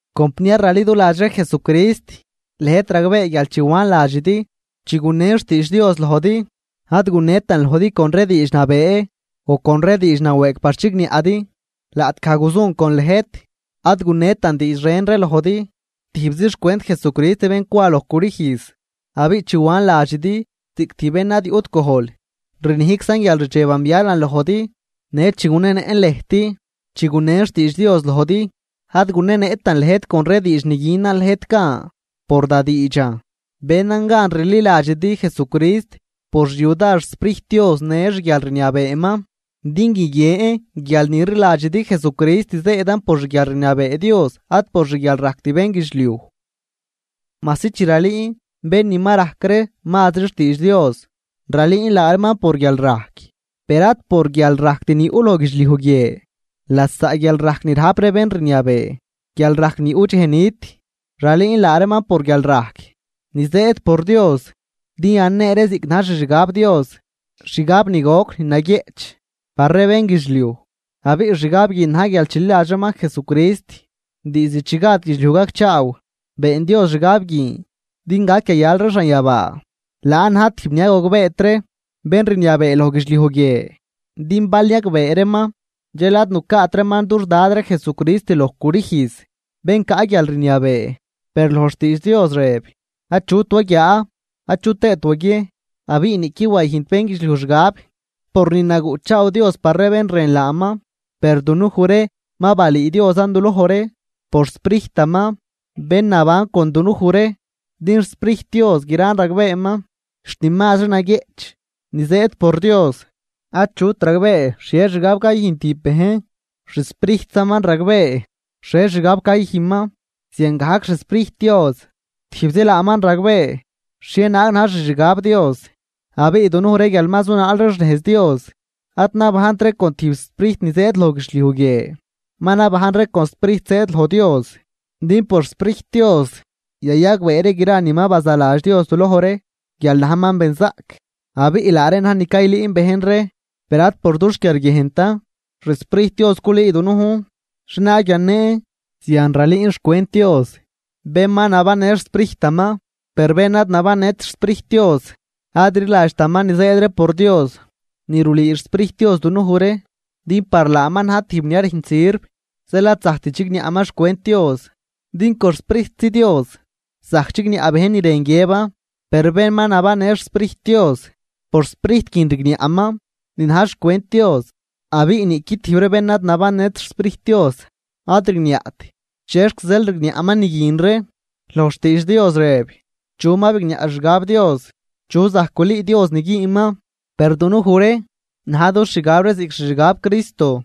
Compniar raliduladx ree Jesucrist lëjt ragbee guial chi wan ladxidi, chi gunen xtiidx Dios lojdi, ad gunetan lojdi con ree diidx nabee o con ree diidx nawëëg par chigniaꞌdi. Laꞌtgaj guzun con lëjt ad gunetan diidx ren ree lojdi, tijbzi xcwent Jesucrist bén cwa loj crüjz. Abiꞌ chi wan ladxidi ziꞌc tijb bén ni ad yuꞌt gojl, rnijczan guial rdxeban bialan lojdi. Në chi gunenëꞌn lëjt, chi gunen xtiidx Dios lojdi, ad gunenëꞌtan lëjt con ree diidx ni günan lëjt gan por da diidxan, benan gan rliladxidi Jesucrist por xyudar xSprijt Dios në xguialrniabeeman. Din guiguien guial ni rliladxidi Jesucrist zëëdan por xguialrniabee Dios ad por xguialrajct bénguidxliuj. Majsi chi ralüün bén ni ma rajc ree mazri xtiidx Dios, ralüün laa reeman por guialrajc. Per ad por guialrajct ni yuꞌ loj guidxliuj guie, lasaꞌ guialrajc ni rajp ree bén rniabee, guialrajc ni yuꞌ dxej nit. Ralüün laa reeman por guialrajc ni zëëd por Dios, din yanee ree ziꞌc na̱j xixgab Dios, xgab ni goc ni naguieꞌch par ree bénguidxliuj, abiꞌ xgab guin na̱j guial chililadx reeman Jesucrist, diizd chi gad guidxliuj gacchaaw been Dios xgab guin din gac yayal ree xanyabaa. Laan na̱j tijb ni ad gogbeet ree bén rniabee loj guidxliuj guie, din bal niagbee reeman dxel ad nucaat reeman dux Dad ree Jesucrist loj crüjz, bén caꞌ guialrniabee. Per loj xtiidx Dios rëb: Achut waguiaa, achu tëët waguiejn abiꞌ niꞌquid wayüjnt bénguidxliuj xgab por ni naguꞌchaaw Dios par ree bén rën laaman. Per dunuj ree ma balüü Diosan duloj ree por xSprijtaman bén naban con dunuj ree, din xSprijt Dios gran ragbeeman, xt ni mazri naguieꞌch ni zëëd por Dios. Achut ragbee xhie xgab cayüjn tijb bejn. Xsprijtsaman ragbee xhie xgab cayüjnman. Ziangajc xSprijt Dios tijbzi laaman ragbee xhienaag na̱j xixgab Dios. Abiꞌ dunuj ree guial ma zunaal ree xnejz Dios, ad nabajnt ree con tijb sprijt ni zëëd loj guidxliuj guie, ma nabajn ree con Sprijt zëëd loj Dios, din por xSprijt Dios yayagbee ree gra ni ma bazaladx Dios duloj ree guial najman benzaꞌc. Abiꞌ laa reen na̱j ni caylüün bejn ree, per ad por dux quiarguiejntan, xSprijt Dios culüü dunujn xhienaag yanen. Zian ralüün xcwent Dios bén ma nabannë xSprijtaman. Per bén ad nabannët xSprijt Dios ad rliladxtaman ni zëëd ree por Dios ni rulüü xSprijt Dios dunuj ree, din par laaman najn tijb ni ad rüjnt sirv. Zeel ad zajct chigniaꞌman xcwent Dios din con xSprijtzi Dios zajc chigniaꞌ bejn ni rën guiëban. Per bén ma nabannë xSprijt Dios por Sprijt guin rigniaꞌman ni na̱j xcwent Dios, abiꞌ niꞌqui tijb ree bén ad nabannët xSprijt Dios ad rigniaꞌt chexc zeel rigniaꞌman ni guin ree. Loj xtiidx Dios rëb: “¿Chu ma bigniaꞌ xixgab Dios? ¿Chu zajc gulüü Dios ni güünman?” Per dunuj ree, na̱j dux xgab ree ziꞌc xixgab Cristo.